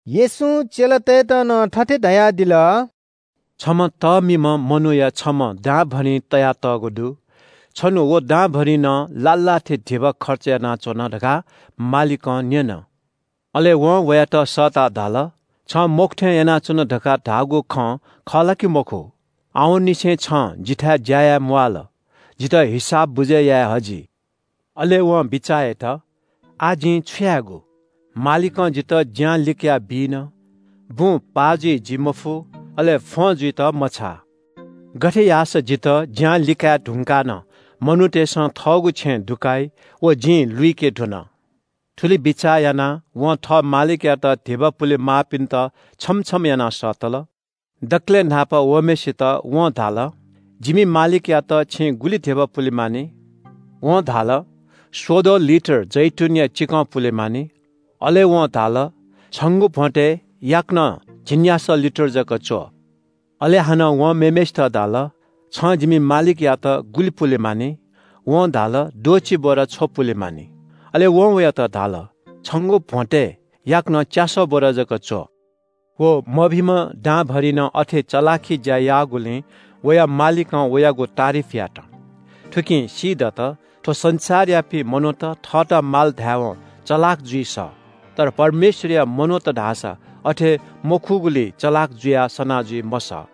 येशूं चेलातय्‌त नं थथे धयादिल – “छम्‍ह तःमिम्‍ह मनूया छम्‍ह दांभरिं तयातःगु दु। छन्‍हु व दांभरिंनं लाः लाः थे धिबा खर्च यानाच्‍वन धकाः मालिकं न्‍यन। अले वं वयात सःताः धाल – ‘छं मखु थें यानाच्‍वन धकाः धाःगु खँ खः ला कि मखु? आवंनिसें छं जिथाय् ज्‍या याये म्‍वाःल। जितः हिसाब बुझय् याये हजि।’ “अले वं बिचाः यात – ‘आः जिं छु यायेगु? मालिकं जितः ज्‍यां लिकयाबी न। बुँ पाः जुइ जिं मफु, अले फ्‍वं जुइत मछाः। गथे याःसा जितः ज्‍यां लिकाये धुंकाः नं मनूतय्‌सं थःगु छेँय् दुकाइ, व जिं लुइके धुन।’ “थुलि बिचाः यानाः वं थः मालिकयात धिबा पुलेमाःपिन्‍त छम्‍ह छम्‍ह यानाः सःतल। दकलय् न्‍हापा वःम्‍हय्‌सित वं धाल – ‘जिमि मालिकयात छिं गुलि धिबा पुले मानि?’ वं धाल – ‘स्‍वद्वः लिटर जैतूनया चिकं पुले मानि।’ अले वं धाल – ‘छंगु भ्‍वंतय् याकनं झिंन्‍यासः लिटर जक च्‍व।’ “अले हानं वं मेम्‍हय्‌सित धाल – ‘छिं जिमि मालिकयात गुलि पुले मानि?’ वं धाल – ‘द्वःछि बोरा छ्व पुले मानि।’ अले वं वयात धाल – ‘छंगु भ्‍वंतय् याकनं च्‍यासः बोरा जक च्‍व।’ “व मभिंम्‍ह दांभरिंनं अथे चलाखि ज्‍या याःगुलिं वया मालिकं वयागु तारिफ यात। थुकिं सीदत, थ्‍व संसारयापिं मनूत थःत माल धायेवं चलाख जुइ सः, तर परमेश्‍वरया मनूत धाःसा अथे मखुगुलिइ चलाख जुयाः सना जुइ मसः।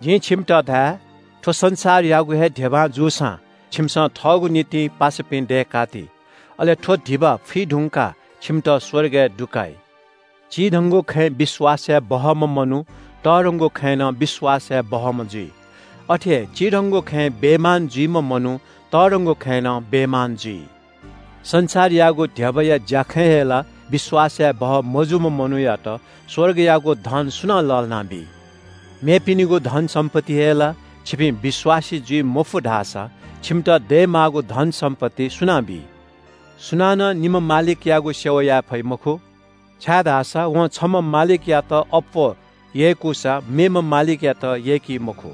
जिं छिमित धाये – थ्‍व संसारयागु हे धिबां जूसां छिमिसं थःगु निंतिं पासापिं दय्‌का ति। अले थ्‍व धिबा फुइ धुंकाः छिमित स्‍वर्गय् दुकाइ।” “चिधंगु खँय् विश्‍वास याये बहःम्‍ह मनू तःधंगु खँय् नं विश्‍वास याये बहःम्‍ह जुइ। अथे हे चिधंगु खँय् बेइमान जुइम्‍ह मनू तःधंगु खँय् नं बेइमान जुइ। संसारयागु धिबाया ज्‍याखँय् हे ला विश्‍वास यायेबहः मजूम्‍ह मनूयात स्‍वर्गयागु धन सुनां लःल्‍हानाबी। मेपिनिगु धनसम्‍पत्तिइ हे ला छिपिं विश्‍वासी जुइ मफु धाःसा छिमित दयेमाःगु धनसम्‍पत्ति सुनां बी?” “सुं च्‍यलं निम्‍ह मालिकयागु सेवा याये फइ मखु, छाय्‌धाःसा वं छम्‍ह मालिकयात अप्‍वः यय्‌कूसा, मेम्‍ह मालिकयात यय्‌की मखु।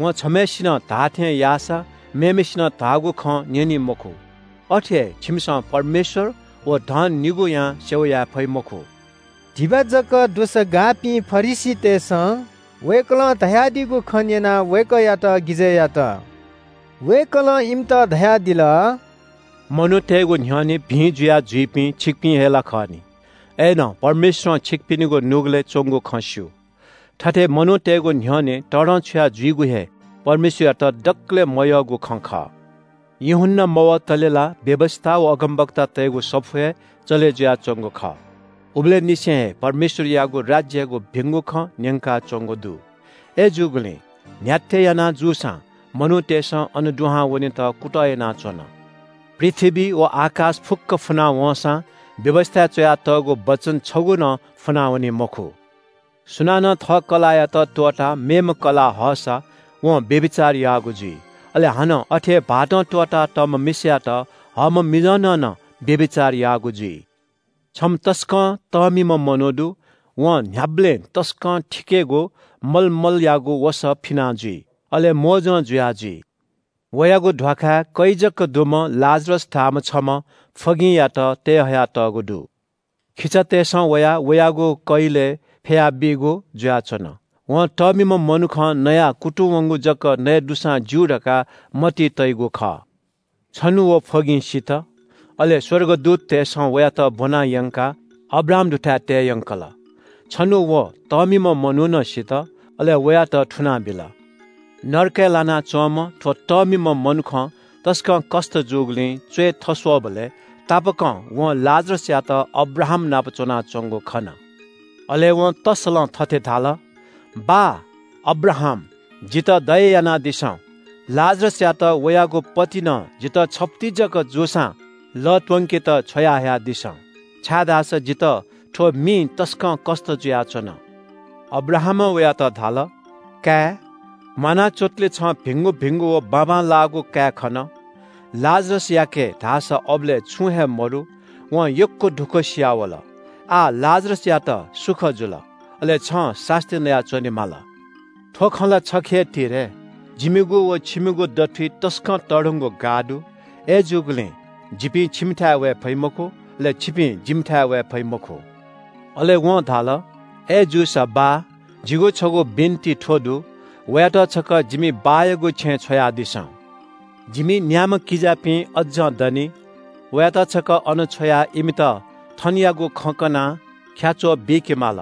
वं छम्‍हय्‌सिनं धाःथें याःसा, मेम्‍हय्‌सिनं धाःगु खँ न्‍यनी मखु। अथे हे छिमिसं परमेश्‍वर व धन निगूयां सेवा याये फइ मखु।” धिबा जक दुसा गाःपिं फरिसीतय्‌सं वय्‌कलं धयादीगु खँ न्‍यनाः वय्‌कःयात गिजय् यात। वय्‌कलं इमित धयादिल – “मनूतय्‌गु न्‍ह्यःने भिं जुया जुइपिं छिकपिं हे ला खः नि। अय्‌नं परमेश्‍वरं छिकपिनिगु नुगलय् च्‍वंगु खँ स्‍यू, थथे मनूतय्‌गु न्‍ह्यःने तःधंछुया जुइगु हे परमेश्‍वरयात दकलय् मयःगु खँ खः। “यूहन्‍ना मवतले ला व्‍यवस्‍था व अगमवक्तातय्‌गु सफू हे चले जुयाच्‍वंगु खः। उबलय्‌ निसें हे परमेश्‍वरयागु राज्‍ययागु भिंगु खँ न्‍यंकाच्‍वंगु दु। अय्‌जूगुलिं न्‍ह्याथे याना जूसां मनूतय्‌सं अन दुहां वनेत कुतः यानाच्‍वन। पृथ्‍वी व आकाश फुक्‍क फुना वंसां व्‍यवस्‍थाय् च्‍वयातःगु वचन छगू नं फुनावनी मखु। “सुनानं थः कलाःयात त्‍वःताः मेम्‍ह कलाः हःसा वं व्‍यभिचार याःगु जुइ। अले हानं अथे हे भाःतं त्‍वःतातःम्‍ह मिसायात हःम्‍ह मिजंनं नं व्‍यभिचार याःगु जुइ।” “छम्‍ह तसकं तःमिम्‍ह मनू दु। वं न्‍ह्याबलें तसकं थिकेगु मलमलयागु वसः फिना जुइ। अले मोजं जुया जुइ। वयागु ध्‍वाखाय् कै जक दुम्‍ह लाजरस धाःम्‍ह छम्‍ह फ्‍वगिंयात तयेहया तःगु दु। खिचातय्‌सं वयाः वयागु कैलय् फ्‍यया बीगु जुयाच्‍वन। वं तःमिम्‍ह मनुखं नयाः कुतुं वंगु जक नये दुसां ज्‍यू धकाः मतिइ तइगु खः। “छन्‍हु व फ्‍वगिं सित, अले स्‍वर्गदूततय्‌सं वयात ब्‍वना यंकाः अब्राहाम दुथाय् तये यंकल। छन्‍हु व तःमिम्‍ह मनू नं सित, अले वयात थुनाबिल। नरकय् लानाच्‍वंम्‍ह थ्‍व तःमिम्‍ह मनुखं तसकं कष्‍ट जूगुलिं च्‍वय् थस्‍वःबलय् तापाकं वं लाजरसयात अब्राहामनाप च्‍वनाच्‍वंगु खन। “अले वं तस्‍सलं थथे धाल – ‘बाः अब्राहाम, जितः दया यानादिसँ। लाजरसयात वयागु पतिनं जितः छफुति जक जूसां लः त्‍वंकेत छ्वयाहयादिसँ, छाय्‌धाःसा जितः थ्‍व मिइ तसकं कष्‍ट जुयाच्‍वन।’ “अब्राहामं वयात धाल – ‘काय्, म्‍वाना च्‍वंतले छं भिंगु भिंगु व बाबांलाःगु काये खन, लाजरसयाके धाःसा अबलय् छुं हे मदु, वं यक्‍व दुःखसिया वल। आः लाजरसयात सुख जुल, अले छं सास्‍ती नया च्‍वनेमाली। थ्‍व खँ ला छखे हे ति रे, जिमिगु व छिमिगु दथुइ तसकं तःधंगु गाः दु, अय्‌जूगुलिं जिपिं छिमिथाय् वये फइ मखु, अले छिपिं जिमिथाय् वये फइ मखु।’ “अले वं धाल – ‘अय्‌जूसा बाः, जिगु छगू बिन्‍ति थ्‍व दु – वयात छकः जिमि बाःयागु छेँय् छ्वयादिसँ। जिमि न्‍याम्‍ह किजापिं अज्‍जं दनि, वयात छकः अन छ्वयाः इमित थनयागु खँ कनाः ख्‍याच्‍वः बीके माल,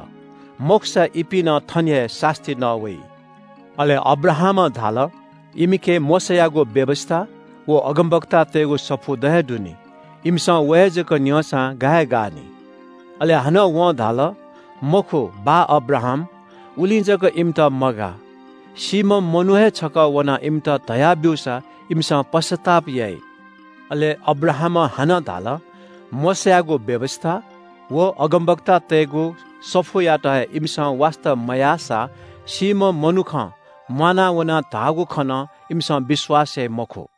मखुसा इपिं नं थन हे सास्‍ती नः वइ।’ “अले अब्राहामं धाल – ‘इमिके मोशायागु व्‍यवस्‍था व अगमवक्तातय्‌गु सफू द हे दु नि, इमिसं व हे जक न्‍यंसां गा हे गानि।’ अले हानं वं धाल – ‘मखु, बाः अब्राहाम, उलिं जक इमित मगाः। सीम्‍ह मनू हे छकः वनाः इमित धया ब्‍यूसा इमिसं पश्‍चाताप याइ।’ अले अब्राहामं हानं धाल – ‘मोशायागु व्‍यवस्‍था व अगमवक्तातय्‌गु सफूयात हे इमिसं वास्‍ता मयाःसा सीम्‍ह मनुखं म्‍वाना वनाः धाःगु खँ नं इमिसं विश्‍वास याइ मखु।’”